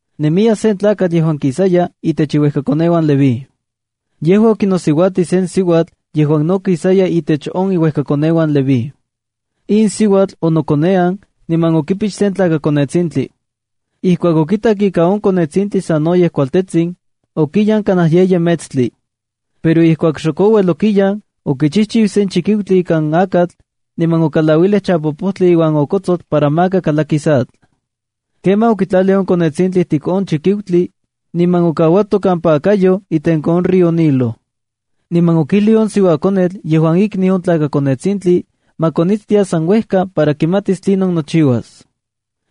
Nemiya sen tlakatl yejuan kisaya intech iuejkakoneuan Leví. Yejua okinosiuatij sen siuatl yejuan no kisaya intech on iuejkakoneuan Leví. In siuatl onokonean niman okipix sen tlakakonetsintli. Ijkuak okitak ika on konetsintli sanoyej kualtetsin, okiyan kanaj yeyi metstli. Pero ijkuak xok ouel okiyan, okichijchiu sen chikiutli ikan akatl, niman okalauilij chapopojtli iuan okotsotl para maka kalakis atl. Kemaj okitlalij on konetsintli ijtik on chikiutli, niman okauato kampa akayoj itenko on río Nilo. Niman okijlij on siuakonetl yejuan ikniu on tlakakonetsintli ma konitstia san uejka para kimatis tlinon nochiuas.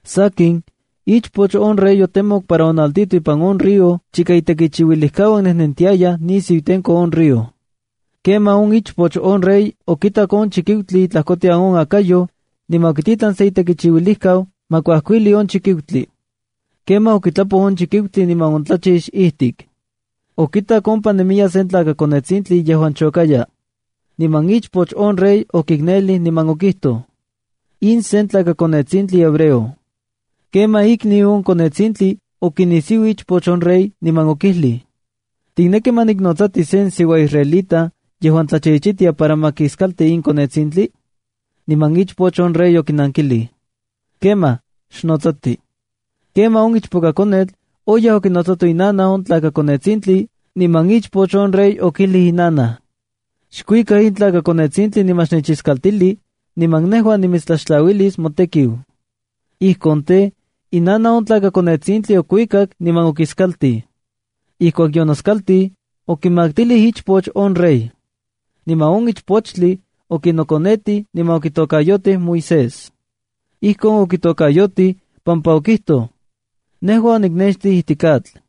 Sakin, ichpoch on reya otemokej para onaltijtoj ipan on río chika itekichiuilijkauan nejnentiayaj nisiu itenko on río. Kemaj on ichpoch on rey okitak on chikiutli itlajkotian on akayoj, niman okititlan se itekichiuilijkau ma kuajkuilij on chikiutli. Kemaj okitlapoj on chikiutli niman ontlachix ijtik. Okitak ompa nemiya sen tlakakonetsintli yejuan chokaya. Niman ichpoch on rey okiknelij niman okijtoj: —In sen tlakakonetsintli hebreo. Kemaj ikniu on konetsintli okinisiuij ichpoch on rey, niman okijlij: —¿Tikneki ma niknotsati sen siuaisraelita yejuan tlachichitia para ma kiskalti in konetsintli? Niman ichpoch on rey okinankilij: —Kemaj, xnotsati. Kemaj on ichpokakonetl oyaj okinotsato inanaj on tlakakonetsintli, niman ichpoch on rey okijlij inanaj: —Xkuika in tlakakonetsintli niman xnechiskaltili, niman nejua nimitstlaxtlauilis motekiu. Ijkon tej, inanaj on tlakakonetsintli okuikak niman okiskaltij. Ijkuak yonoskaltij, okimaktilij ichpoch on rey. Niman on ichpochtli okinokonetij niman okitokayotij Moisésb. Ijkon okitokayotij pampa okijtoj: —Nejua onikixtij ijtik atl.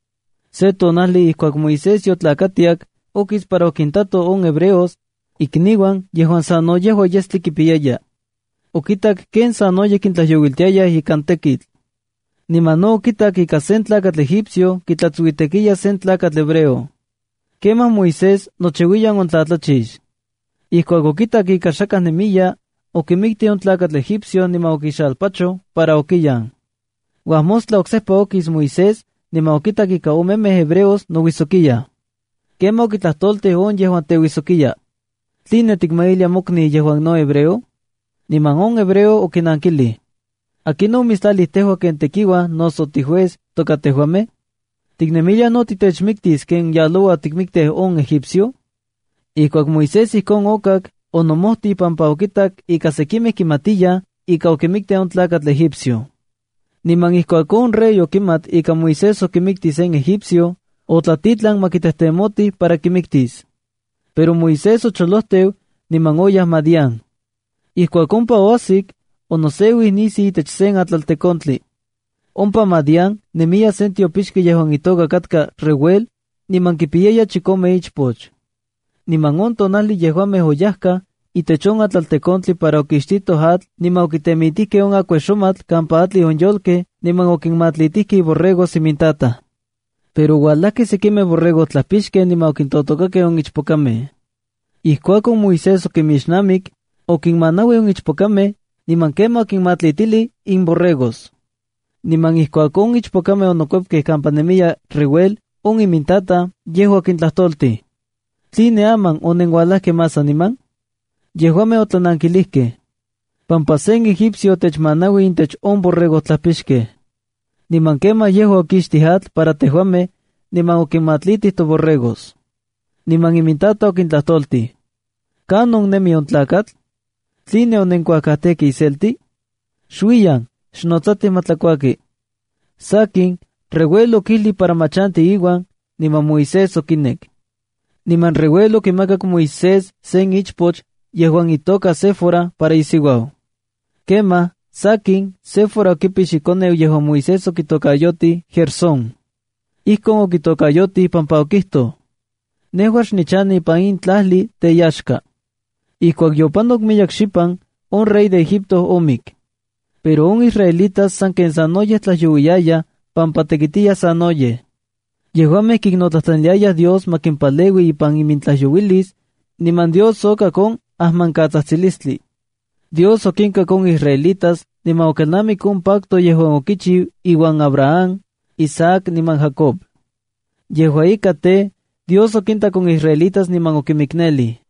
Se tonajli ijkuak Moisés yotlakatiak, okis para okintato on hebreos, ikniuan yejuan sano yejua yestli kipiyayaj. Okitak ken sanoyej kintlajyouiltiayaj ikan tekitl. Niman no okitak ika sen tlakatl Egipcio kitlatsuitekiya sen tlakatl hebreo. Kemaj Moisés nochiuiyan ontlatlachix. Ijkuak okitak ika xakaj nemiya, okimiktij on tlakatl Egipcio niman okixalpachoj para okiyan. Uajmostla oksejpa okis Moisés niman okitak ika omemej hebreos nouijsokiyaj. Kemaj okitlajtoltij on yejuan teuijsokiya. —¿Tline tikmailia mokniu yejuan no hebreo? Niman on hebreo okinankilij: —¿Akinon omitstlalij tejua ken tekiuaj noso tijuez toka tejuamej? ¿Tiknemilia no tinechmiktis ken yaloua otikmiktij on Egipcio? Ijkuak Moisés ijkon okak, onomojtij pampa okitak ika sekimej kimatiyaj ika okimiktij on tlakatl Egipcio. Niman ijkuak on rey okimat ika Moisés okimiktij sen Egipcio, otlatitlan ma kitejtemotij para kimiktis. Pero Moisés ocholojteu niman oyaj Madián. Ijkuak ompa oajsik, onoseuij nisiu itech sen atlaltekontli. Ompa Madián nemiya sen tiopixki yejuan itoka katka Reuel, niman kipiyaya chikome ichpoch. Niman on tonajli yejuamej oyajkaj itech on atlaltekontli para okixtitoj atl niman okitemitijkej on akuexomatl kampa atlij on yolkej, niman okinmatlitijkej iborregos imintataj. Pero oualajkej sekimej borregojtlajpixkej niman okintotokakej on ichpokamej. Ijkuakon Moisés okinmixnamik, okinmanauij on ichpokamej, niman kemaj okinmatlitilij imborregos. Niman ijkuak on ichpokamej onokuepkej kampa nemiya Reuel on imintataj, yejua okintlajtoltij: —¿Tline aman onenualajkej más saniman? Yejuamej otlanankilijkej: —Pampa sen egipcio otechmanauij intech on borregojtlajpixkej. Niman kemaj yejua okixtij atl para tejuamej, niman okimatlitij toborregos. Niman imintataj okintlajtoltij: —¿Kanon nemi on tlakatl? ¿Tline onenkuajkajtejkej iselti? Xuiyan, xnotsatij ma tlakuaki. Sakin, Reuel okijlij para ma chanti iuan, niman Moisés okinek. Niman Reuel okimakak Moisés sen ichpoch yejuan itoka Séfora para isiuau. Kemaj, sakin Séfora okipix ikoneu yejuan Moisés okitokayotij Gersónc. Ijkon okitokayotij pampa okijtoj: “Nejua xnichanej ipan in tlajli teyaxka.” Ijkuak yopanok miyek xipan, on rey de Egipto omik. Pero on israelitas sanken sanoyej tlajyouiyayaj pampa tekitiyaj sanoyej. Yejuamej kiknotlajtlaniliayaj Dios ma kimpaleui ipan imintlajyouilis, niman Dios okak on ajmankatsatsilistlij. Dios okinkak on israelitas niman okelnamik on pacto yejuan okichiu iuan Abraham, Isaac niman Jacob. Yejua ika tej, Dios okintak on israelitas niman okinmiknelij.